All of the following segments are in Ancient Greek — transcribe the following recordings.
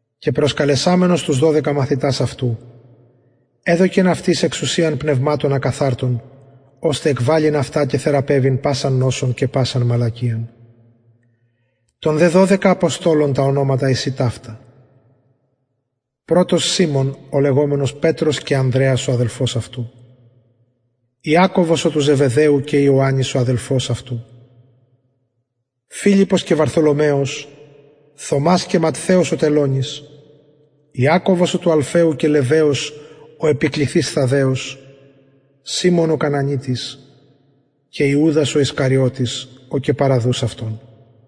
και προσκαλεσαμενος τους δωδεκα μαθητας αυτου εδωκεν αυτοις εξουσιαν πνευματων ακαθαρτων ωστε εκβαλλειν αυτα και θεραπευειν πασαν νοσον και πασαν μαλακιαν των δε δωδεκα αποστολων τα ονοματα εστιν ταυτα πρωτος σιμων ο λεγομενος πετρος και ανδρεας ο αδελφος αυτου ιακωβος ο του ζεβεδαιου και ιωαννης ο αδελφος αυτου φιλιππος και βαρθολομαιος θωμας και ματθαιος ο τελωνης ιακωβος ο του αλφαιου και λεββαιος ο επικληθεις θαδδαιος σιμων ο κανανιτης και ιουδας ισκαριωτης ο και παραδους αυτον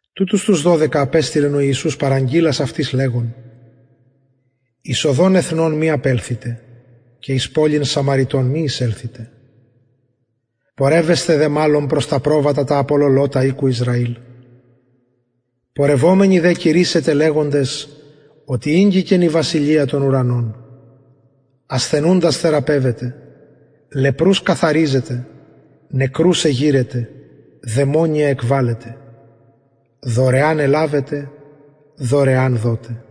τουτους τους δωδεκα απεστειλεν ο ιησους παραγγειλας αυτοις λεγων εις οδον εθνων μη απελθητε και εις πολιν σαμαρειτων μη εισελθητε πορευεσθε δε μαλλον προς τα προβατα τα απολωλοτα οικου ισραηλ πορευομενοι δε κηρυσσετε λεγοντες οτι ηγγικεν η βασιλεια των ουρανων ασθενουντας θεραπευετε λεπρους καθαριζετε δαιμονια εκβαλλετε δωρεαν ελαβετε δωρεαν δοτε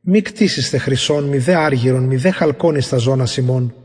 μη κτησησθε χρυσον μηδε αργυρον μηδε χαλκον εις τας ζωνας υμων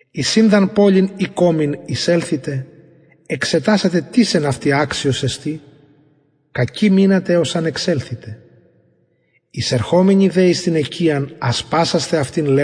εις ην δ αν πολιν η κωμην εισελθητε εξετασατε τις εν αυτη αξιος εστιν κακει μεινατε εως αν εξελθητε εισερχομενοι δε εις την οικιαν ασπασασθε αυτην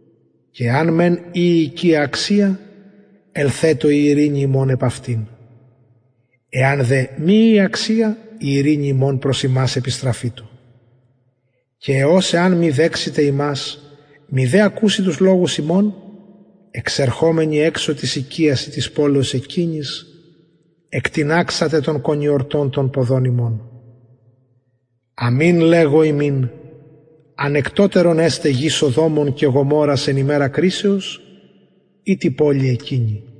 και εαν μεν η η οικια αξια ελθετω η ειρηνη υμων επ αυτην εαν δε μη η αξια η ειρηνη υμων προς υμας επιστραφητω και ος εαν μη δεξηται υμας μηδε ακουση τους λογους υμων εξερχομενοι της οικιας η της πολεως εκεινης εκτιναξατε τον κονιορτον των ποδων υμων αμην λεγω υμιν ανεκτοτερον εσται γη σοδομων και γομορρων εν ημερα κρισεως η τη πολει εκεινη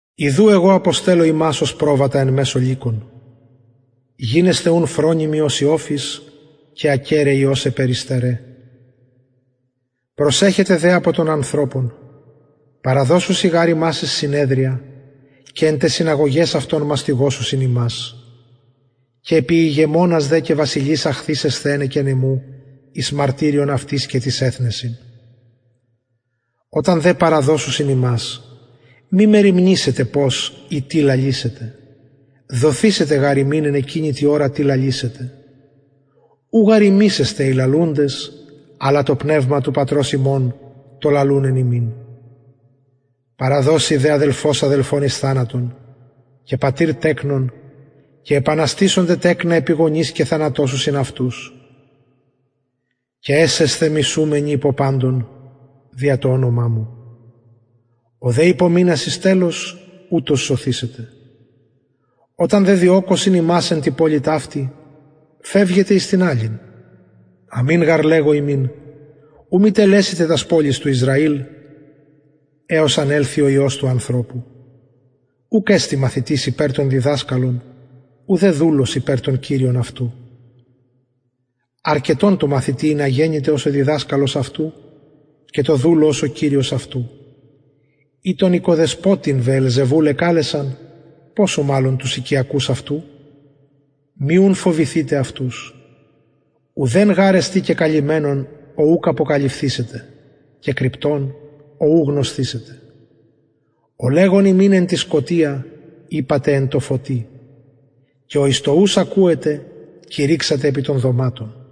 ιδου εγω αποστελλω υμας ως προβατα εν μεσω λυκων γινεσθε ουν φρονιμοι ως οι οφεις και ακεραιοι ως αι περιστεραι προσεχετε δε απο των ανθρωπων παραδωσουσιν γαρ υμας εις συνεδρια και εν ταις συναγωγαις αυτων μαστιγωσουσιν υμας και επι ηγεμονας δε και βασιλεις αχθησεσθε ενεκεν εμου εις μαρτυριον αυτοις και τοις εθνεσιν οταν δε παραδιδωσιν υμας μη μεριμνησητε πως η τι λαλησητε δοθησεται γαρ υμιν εν εκεινη τη ωρα τι λαλησετε ου γαρ υμεις εστε οι λαλουντες αλλα το πνευμα του πατρος υμων το λαλουν εν υμιν παραδωσει δε αδελφος αδελφον εις θανατον και πατηρ τεκνον και επαναστησονται τεκνα επι γονεις και θανατωσουσιν αυτους και εσεσθε μισουμενοι υπο παντων δια το ονομα μου ο δε υπομεινας εις τελος ουτος σωθησεται οταν δε διωκωσιν υμας εν τη πολει ταυτη φευγετε εις την αλλην αμην γαρ λεγω υμιν ου μη τελεσητε τας πολεις του ισραηλ εως αν ελθη ο υιος του ανθρωπου ουκ εστιν μαθητης υπερ τον διδασκαλον ουδε δουλος υπερ τον κυριον αυτου αρκετον τω μαθητη ινα γενηται ως ο διδασκαλος αυτου και ο δουλος ως ο κυριος αυτου ει τον οικοδεσποτην βεελζεβουλ εκαλεσαν ποσω μαλλον τους οικειακους αυτου μη ουν φοβηθητε αυτους ουδεν γαρ εστιν κεκαλυμμενον ο ουκ αποκαλυφθησεται και κρυπτον ο ου γνωσθησεται ο λεγω υμιν εν τη σκοτια ειπατε εν τω φωτι και ο εις το ους ακουετε κηρυξατε επι των δωματων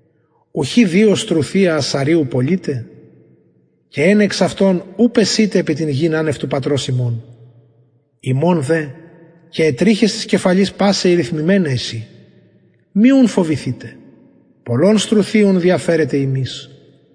ουχι δυο στρουθια ασσαριου πωλειται και εν εξ αυτων ου πεσειται επι την γην ανευ του πατρος υμων υμων δε και αι τριχες της κεφαλης πασαι ηριθμημεναι εισιν μη ουν φοβηθητε πολλων στρουθιων διαφερετε υμεις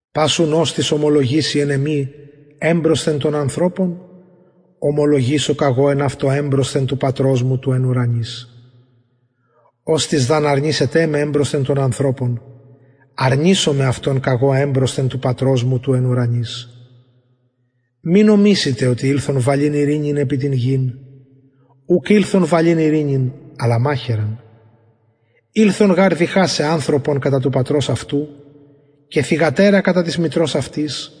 πας ουν οστις ομολογησει εν εμοι εμπροσθεν των ανθρωπων ομολογησω καγω εν αυτω εμπροσθεν του πατρος μου του εν ουρανοις οστις δ αν αρνησηται με εμπροσθεν των ανθρωπων αρνησομαι αυτον καγω εμπροσθεν του πατρος μου του εν ουρανοις μη νομισητε οτι ηλθον βαλειν ειρηνην επι την γην ουκ ηλθον βαλειν ειρηνην αλλα μαχαιραν ηλθον γαρ διχασαι ανθρωπον κατα του πατρος αυτου και θυγατερα κατα της μητρος αυτης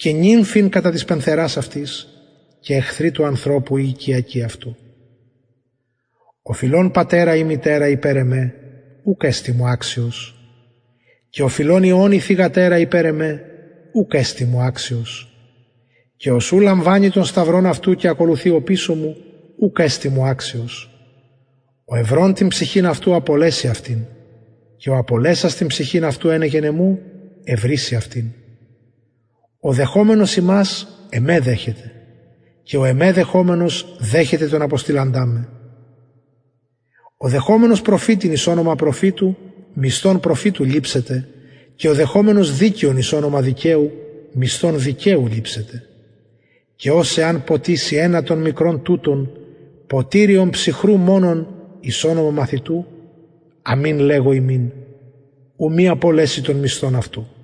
και νυμφην κατα της πενθερας αυτης και εχθροι του ανθρωπου οι οικειακοι αυτου ο φιλων πατερα η μητερα υπερ εμε ουκ εστιν μου αξιος και ο φιλων υιον η θυγατερα υπερ εμε ουκ εστιν μου αξιος και ος ου λαμβανει τον σταυρον αυτου και ακολουθει οπισω μου ουκ εστιν μου αξιος ο ευρων την ψυχην αυτου απολεσει αυτην και ο απολεσας την ψυχην αυτου ενεκεν εμου ευρησει αυτην ο δεχομενος υμας εμε δεχεται και ο εμε δεχομενος δεχεται τον αποστειλαντα με ο δεχομενος προφητην εις ονομα προφητου μισθον προφητου ληψεται και ο δεχομενος δικαιον εις ονομα δικαιου μισθον δικαιου ληψεται και ος εαν ποτιση ενα των μικρων τουτων ποτηριον ψυχρου μονον εις ονομα μαθητου αμην λεγω υμιν ου μη απολεση τον μισθον αυτου